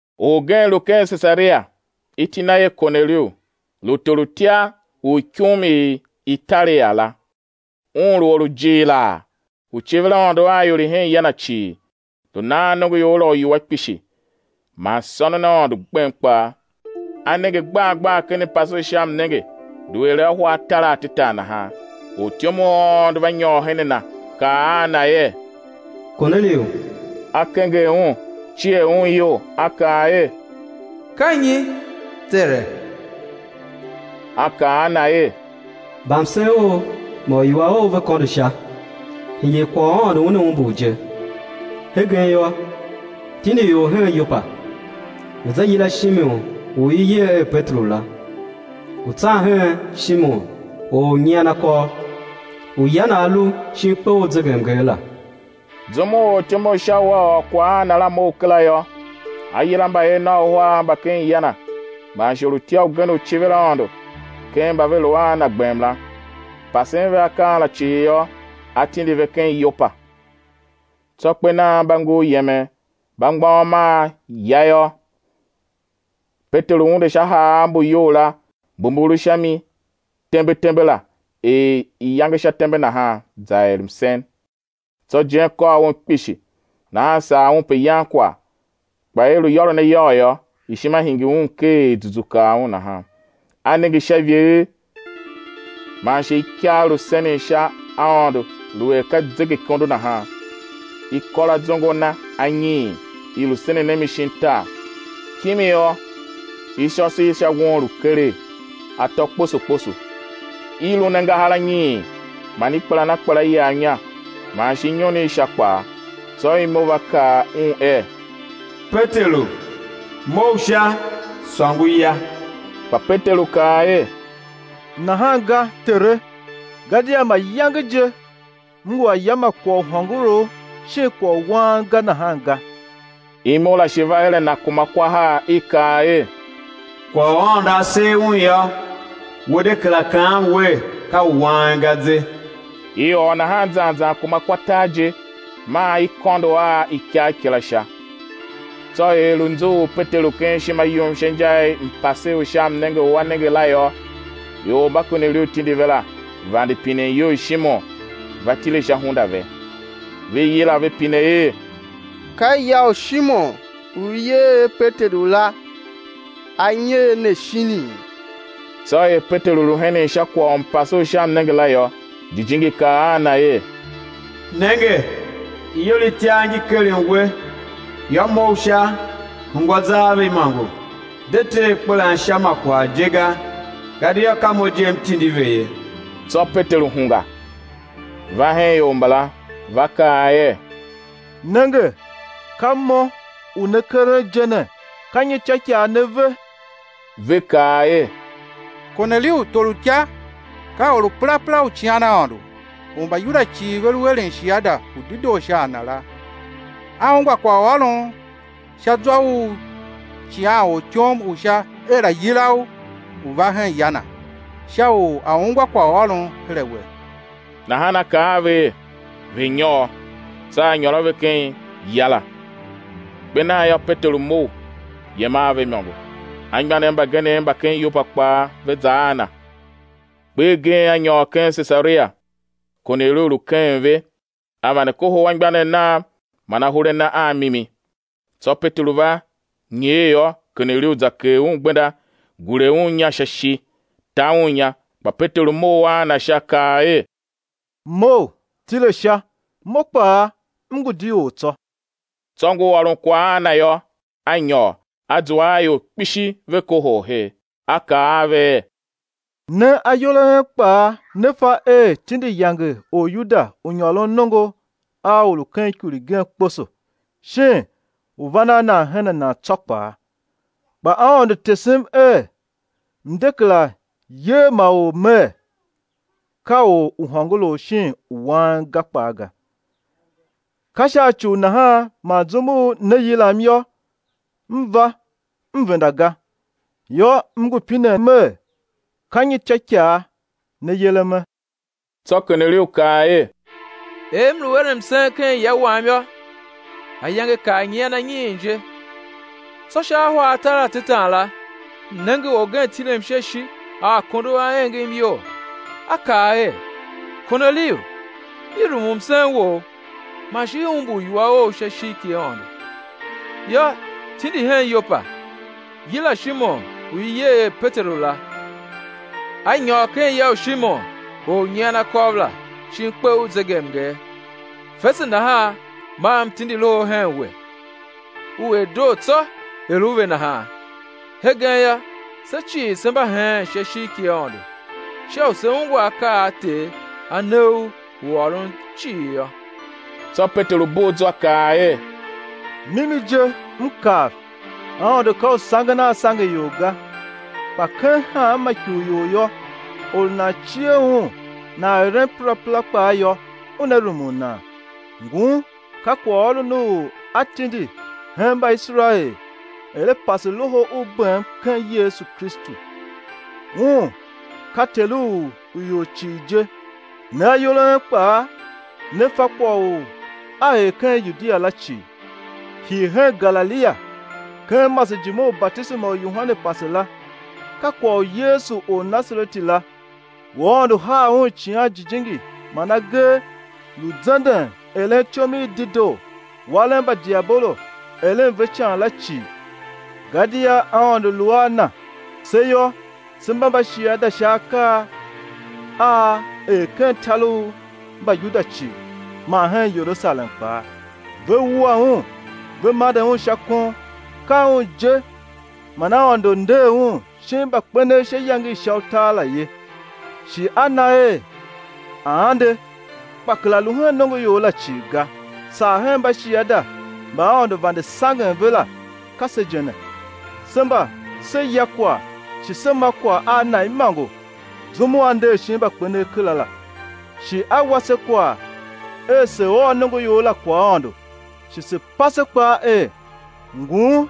Orgen lu ken Sesaria, iti na er Korneliu, lu torutya u ikum i Italia la. Un lu or u jighilaa, u civir Aôndo a ior i hen ya na cii, lu nan nongoior la uiwua kpishi, man sônon Aôndo gbem kpaa. A nenge gbar gbar ken mpase u sha mnenge lu er ahwa atar atetan nahan, ortyom u Aôndo va nyôr her a na, kaa a na er: Korneliu! A kenger un, cier un iyol, a kaa er: Ka nyi, tere? A kaa a na er: Mbamsen ou man uiwua ou ve kôndo sha, hingir kwagh u Aôndo Una umbur je. Hegen yô, tindi ior hen Yopa, ve̱ za yila Shimon u i yer er Peteru la; ngu tsan hen Shimon, or u nyian akôv, u ya na a lu shin kpe u zegemnger la. Zum u ortyom u Sha u a ôr kwagh a na la mough kera yô, a yila mbayev nav uhar mba ken ya na, man shi orutya ugen u civir Aôndo, ken mba ve lu a na gbem la; pasen ve akaa la cii yô, a tindi ve ken Yopa. Tsô kper nan mba ngur yemen, mba mgbôghom a ya yô, Peteru unde sha haav mbu iyou la mbu mbu lu sha mi tembe tembe la er iyange sha tembe nahan, za er msen. Tsô ijen kôr un kpishi; nahan sar un pe yan kwagh; kpa er i lu yôron a yôr yô, ishima hingir un ker er zuzu kar un nahan. A nenge Sha ivegher, man shi ikagh lu senen sha Aôndo, lu er ka zegeikondo nahan, i kôr azongo na anyiin, i lu senen a mi shin tar. Kimi yô, ishôso i sha won lu keregh, atô kposo kposo, i lun angahar anyiin, man i kpelan a kpela iyav inya, man shi inyon i sha kpaa. Tsô imo va kaa un er: Peteru, mough sha, sôngo, ya! Kpa Peteru kaa er: Nahan ga, Tere, gadia mayange je m ngu a ya ma kwagh u hôngorough shin kwagh u wang ga nahan ga. Imo la shi va her a na kuma kwa har, i kaa er: Kwagh u Aôndo A ser un yô, we de kera kaan wer, ka u wang ga ze. I ôr nahan zan zan kuma kwa tar je; maa i kôndo a ikagh kila Sha. Tsô er lu nzughul Peteru ken ishima yum sha inja i mpase u sha mnenge u a nenge la yô, ior mba Korneliu tindi ve la, vande pinen iyou i Shimon, va tile sha hunda ve. Ve yila, ve pine er: Ka ya u Shimon, u i yer er Peteru la a nyer ne shinii? Tsô er Peteru lu henen sha kwagh u mpase u sha mnenge la yô, Jijingi kaa a na er: Nenge, ior itiar ngi keren we. Yô, mough sha, hungwa za a ve imôngo, de te akpelan sha ma kwagh je ga, gadia ka Mo je M tindi ve ye. Tsô Peteru hungwa, va hen ior mbala, va kaa er: Nenge, ka mo u ne keren je ne. Ka nyi ityôikaa ne ve? Ve kaa er: Korneliu torutya, ka or u perapera u cian Aôndo, u Mbayuda cii ve lu eren shiada u dedoo sha a na la, a ungwa kwaghôron sha zwa u icighanortyom u Sha er a̱ yila u, u̱ va hen ya na, Sha u a̱ ungwa kwaghôron her a we. Nahan a kaa a ve er, ve̱ nyôr, tsô a nyôr a ve ken ya la. Kper nan yô, Peteru mough, yem a ve imôngo. Anmgbianev mbagenev mba ken Yopa kpaa ve za a na. Kper gen a nyôr ken Sesaria. Korneliu lu keghen ve, a vande kohol anmgbianev nav man ahur a na a mimi. Tsô Peteru va nyer yô, Korneliu za kegh un gbenda, gure un inya sha ishi, ta un inya. Kpa Peteru mough a na sha, kaa er: Mough, tile sha, mo kpaa m ngu di or tsô. Tsô ngur ôron kwagh a na yô, a nyôr, a zua a ior kpishi, ve kohol her. A kaa a ve er: Ne ayol a en kpaa ne fa er tindi yange Oryuda u nyôron nongo a or u ken ikur igen kposo shin u van a va hen nan tsô kpaa; kpa Aôndo tesem er m̱ de kera yer ma or mer, ka or u hôngorough shin u wang ga kpaa ga. Ka sha ci u nahan man zum u ne yilam yô, m va m venda ga. Yô, m ngu pinen mer: Ka nyi ityôikaa ne yereme? Tsô Korneliu kaa er: Er m lu eren msen ken ya wam yô, ayange kar nyian anyiin je, tsô sha ahwa atar atetan la, m nenge orgen tilem sha ishi a akondo a engem iyol, a kaa er: Korneliu, i rumun msen wou, man shi i umbur uiwua ou sha ishigh ki Aôndo. Yô, tindi hen Yopa, yila Shimon u i yer er Peteru la, a nyôr ken ya u Shimon, or u nyian akôv la, shin kpe u zegemnger. Fese nahan maa M tindi loho hen we; u er doo tsô er u ve nahan. Hegen yô, se cii se mba heen sha ishigh ki Aôndo, sha u se̱ ungwa akaa a Ter A ne u u ôron cii yô. Tsô Peteru bugh zwa kaa er: Mimi je, m kav, Aôndo ka u sangen a sange ior ga, kpa ken hanma ikurior yô, or u nan cie Un, nan eren perapera kpaa yô, Una rumun nan. Ngun ka kwaghôron u A tindi hen Mbaiserael er A pase loho u bem ken Yesu Kristu. Un ka Ter u ior cii je. Ne ayol a en kpaa ne fa kwagh u a er ken Yudia la cii, hii hen Galilia, ken masejime u batisema u Yohane pase la; ka kwagh u Yesu Ornasareti la, u Aôndo haa Un Icighan Jijingi man agee; lu zenden, eren ityom i dedoo, waren mba diabolo eren ve ican la cii, gadia Aôndo lu a Na. Se yô, se mba mbashiada sha akaa a A er ken tar u Mbayuda cii, man hen Yerusalem kpaa, ve wua Un, ve mande Un sha kon. Ka Un je man Aôndo nder Un shin mbakpenev sha iyange i sha utar la ye, shi A na er A̱ ande, kpa kera lu hen nongoior la cii ga, saa hen mbashiada mba Aôndo vande sangen ve la, ka se je ne, se mba se ya kwagh shi se ma kwagh a Na imôngo, zum u A nder shin mbakpenev kera la. Shi A wa se kwagh er se̱ ôr nongoior la kwaghaôndo, shi se̱ pase kpaa er: Ngun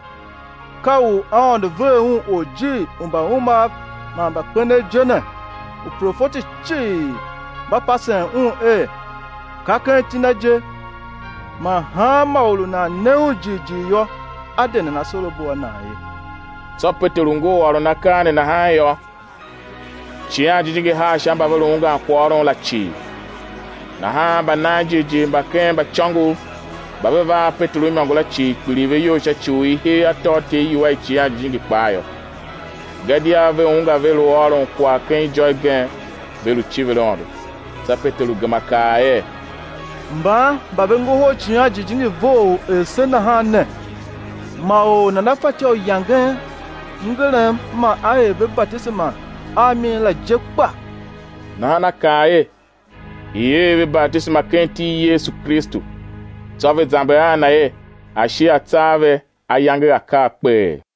ka u Aôndo ver Un Orjir u mbaumav man mbakpenev je ne. Uprofeti cii mba pasen Un er, ka ken iti Na je man hanma or u nan ne Un jighjigh yô, á de nan asorabo a nan ye. Tsô Peteru ngur ôron akaa ne nahan yô, Icighan Jijingi haa sha mba ve lu ungwan kwaghôron la cii. Nahan mbananjighjigh mba ken mbaicôngov mba ve va a Peteru imôngo la cii, kpiligh ve iyol sha ci u i hee atôatyev iwua i Icighan Jijingi kpaa yô. Gadia ve ungwa ve lu ôron kwagh ken ijô igen, ve lu civir Aôndo. Tsô Peteru gema kaa er: Mban mba ve ngohol Icighan Jijingi vough er se nahan ne, ma or nana fatyô u yangen mngerem ma á er ve batisema a mi la je kpa? Nahan a kaa er i̱ er ve batisema ken iti i Yesu Kristu. Tsô ve zamber a Na er a̱ shi a tsa a ve ayange a̱ kar kpeghee.